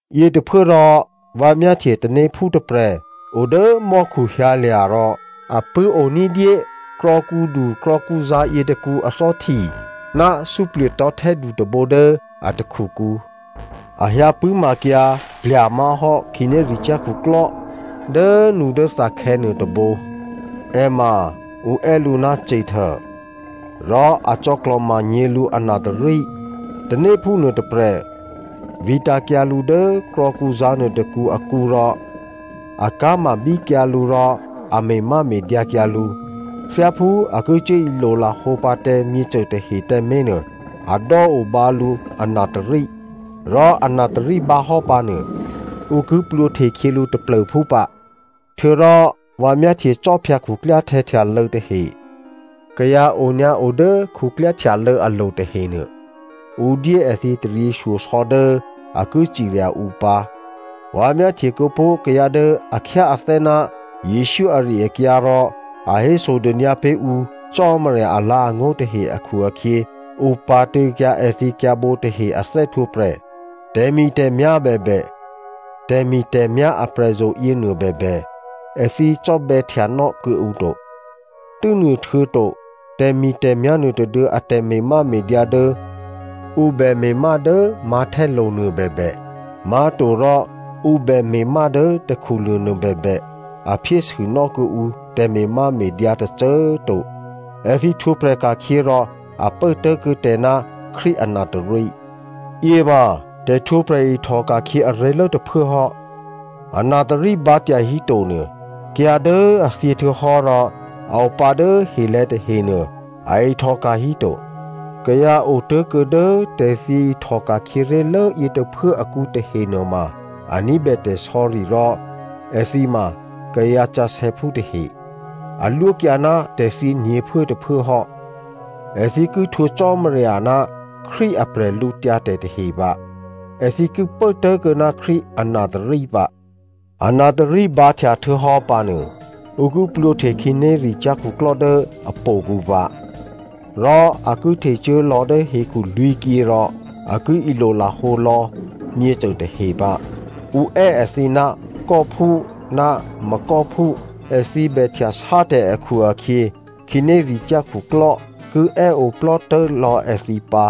Yětôphuốrò vǎ myáhtye tanéphú tôprè̤ o dố mò́khu hyǎlya̤ rò a pṳ̂́o ní̤dyé krò̌kǔdu krò̌kǔzǎ̤ yětôkǔ athò́hti ná suplye̤tò̤́htè́du tôbǒ dố a takhukǔ. A hyǎ pṳ̂́makyǎ plya̤ má̤hò́ khǐnéricyá̤ khuklò́ dốnudốthakhè̌ nuôtôbǒ. È ma ǔ è́ lǔ ná Satan. Rò a cò̌klò̤manyě̤ lǔ anatôrí. Tanéphú nuôtôprè̤ vǐtǎ̤kyǎ lǔ dố krò̌kǔzǎ̤ nuôtôkǔ akǔ rò a ká̤mabíkyǎ lǔ rò a me̤máme̤dyǎ kyǎ lǔ. Thyáphú a ki cuố ilolahǒ pǎ tǎ myěcô tahe tǎmé̤ nuô a dò́ obǎ lǔ anatôrí. Rò anatôrí bǎhò́ pǎ nuô, ǔ ki plwǒhte khyě lǔ taplô̤phú pǎ. Htuô̌rò vǎ myáhtye khwí khuklyáhtè̌ htyalô̌ tahe. Kayǎ onyǎo dố khuklyáhtyalô̌ alo̤ tahenuô, ǔ dyé èthǐ taryěshyosò̌ dố a ki cirya ǔ pǎ. Vǎ myáhtye kuô̌pó̤ kayǎ dố a khyáathè́ ná Jesǔ ari-akyǎ rò a hésodônyǎ pé̤ ǔ Cò́marya alǎ̤angó̤ tahe akhu-akhyě, ǔ pǎ̤tṳ̂̌kyǎ èthǐ kyǎ̤bǒ tahe a thè́htwǒprè̤. Tè̤mi̤tè̤myá̤ bèbè, tè̤mi̤tè̤myá̤ aprè̤zo̤ yěnuô bèbè, èthǐ cò́bè̌htyanò́ kuô̌ǔ to. Tû́nuôhtuô̌to tè̤mi̤tè̤myá̤ nuôtôduô̌ a tè̤me̤máme̤dyǎ dố ǔ bè me̤má dố mǎ̤htè́lo̤ nuôbèbè, má̤torò ǔ bè me̤má dố takhulo̤ nuôbèbè, a phyésûnò́ kuô̌ǔ tè̤me̤máme̤dyǎ tôcô꤮ to. Èthǐ htwǒprè̤ ka̤khyě rò a pố tố̤kuô̌ tè̤ ná Krístu anatôrí. Yěma tè̤htwǒprè̤ ihtò ka̤khyě aré̤lố tôphuố hò́. Anatôrí bǎ tyahíto nuô, kayǎ dố a thyě htuô̌hò́ rò a o pǎ dố helè̤̌ tahenuô, a ihtòka̤ híto. Kayǎ otố̤kuô̌ dố tè̤thyě ihtòka̤khyě ré̤lố yě tôphuố akǔ tahe nuôma a ní̤bè tè̤sò̌ri rò èthǐ ma kayǎ sǎsè̌phú tahe. A lwókyǎ ná tè̤thyě nyě̤phuốtôphuố hò́. Èthǐ ki htwǒ Cò́marya ná Krístu a bwídu tahe pǎ. Èthǐ ki pố tố̤kuô̌ ná Krístu anatôrí pǎ. Anatôrí bǎhtya htuô̌hò́ pǎ nuô, ǔ ki plwǒhte khǐnéricyá̤ khuklò́ dố ahtò̌kǔ pǎ. Rò a ki htecuố lò̌ hekhu lwǐ̤kyě rò a ki ilolahǒ lò̌ myěcô tahe pǎ. Ǔ è́ èthǐ ná Gogphú ná Magog phú. Èthǐ bè htyasátè̤ akhu-akhyě khǐnéricyá̤ khuklò́ ki è́ oplò́tố̤lò̌ èthǐ pǎ.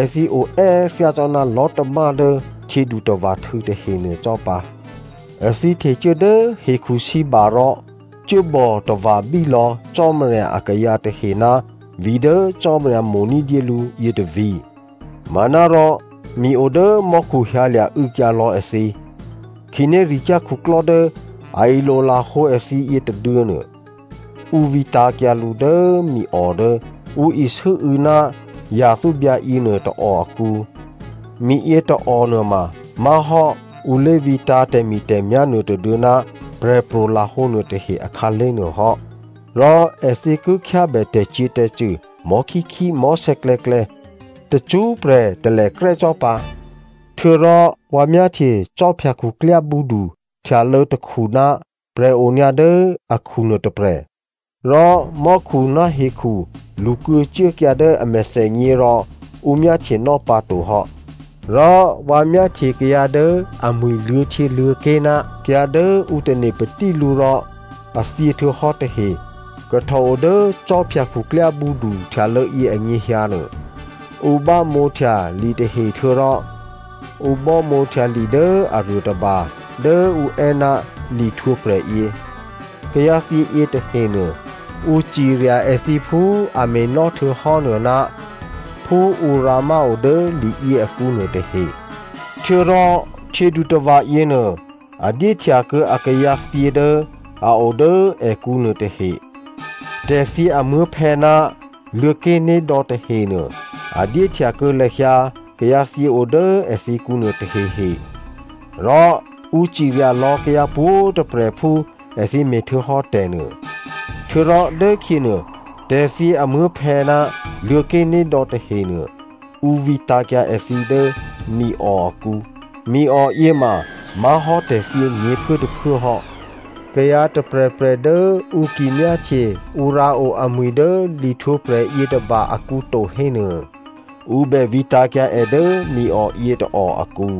Èthǐ oè́ thyácò́ná lò̤́tamá dố htyědutava̤htû̌ tahe nuô cò́ pǎ. Èthǐ htecuố dố hekhusǐba rò cuốbò tava̤bí lò̌ Cò́marya akayǎ tahe ná vǐ̤ dố Cò́marya mo̤ ní̤dyé lǔ yětôvǐ̤. Manárò mi o dố mò́khu hyǎlya̤ û̌kyǎ lò̌ èthǐ. Khǐnéricyá̤ khuklò́ dố a ilolahǒ èthǐ yětôduô̌nuô, ǔ vǐtǎ̤kyǎ lǔ dố miò dố ǔ isû́û̌ ná yathúbyǎ yěnuô tôò akǔ. Miyě tôò nuôma má̤hò́ ǔ lé̤vǐtǎ̤ tè̤mi̤tè̤myá̤ nuôtôduô̌ ná prè̤pro̤ lahǒ nuôtahe akhǎlé̤ nuô hò́. Rò èthǐ ki khyábè tè̤cyě̤tè̤cṳ̂ mò̤́khíkhí mò̤́sè̌klè̌klè̌ tacṳ́prè̤ talèkrè́ cò́ pǎ. Htuô̌rò vǎ myáhtye khwí khuklyábǔdu htyalô̌ tôkhu ná prè̤ onyǎ dố akhu nuôtôprè̤. Rò mò́khu ná hekhu lṳkuô̌ cuốkyǎ dố a mèthènyě rò ǔ myáhtyenò́ pǎtohò́. Rò vǎ myáhtye kayǎ dố amwi̤ luô̌htyěluô̌ké̤ ná kayǎ dố ǔ tane̤ patí lǔ rò a thyěhtuô̌hò́ tahe kahtòo dố khwí khuklyábǔdu htyalô̌ yě anyěhyǎ nuô. Ǔ bámǒhtya litahe htuô̌rò ǔ bámǒhtya li dố aruô tôba dố ǔ è́ ná lihtwǒprè̤ yě. Kayǎthyě yětahenuô, ǔ cirya èthǐ phú a me̤nò́ htuô̌hò́ nuô ná phú ǔ rǎmáo dố liyě akǔnuô tahe. Htuô̌rò htyědutava̤ yěnuô a dyéhtyakuô̌ akayǎ thyě dố a o dố èkǔ nuô tahe. Tè̤thyě amuố̤phè̌ ná Luô̤̌ké̤nédò̌ tahenuô, a dyéhtyakuô̌ lahyǎ kayǎthyě o dố èthǐkǔ nuôtahehe. Rò ǔ cirya lò̌ kayǎ pwǒ̤꤮ tôprè̤ phú èthǐ me̤htuô̌hò́ tè̤nuô. Htuô̌rò dốkhyěnuô, tè̤thyě amuố̤phè̌ ná Luô̤̌ké̤nédò̌ tahenuô, ǔ vǐtǎ̤kyǎ èthǐ dố miò akǔ. Miò yěma má̤hò́ tè̤thyě nyě̤phuốtôphuố hò́. Kayǎ tôprè̤prè̤ dố ǔ ki myáhtye ǔ rǎo amwi̤ dố lihtwǒprè̤ yětôba akǔ to hé nuô, ǔ bè vǐtǎ̤kyǎ è dố miò yětôò akǔ.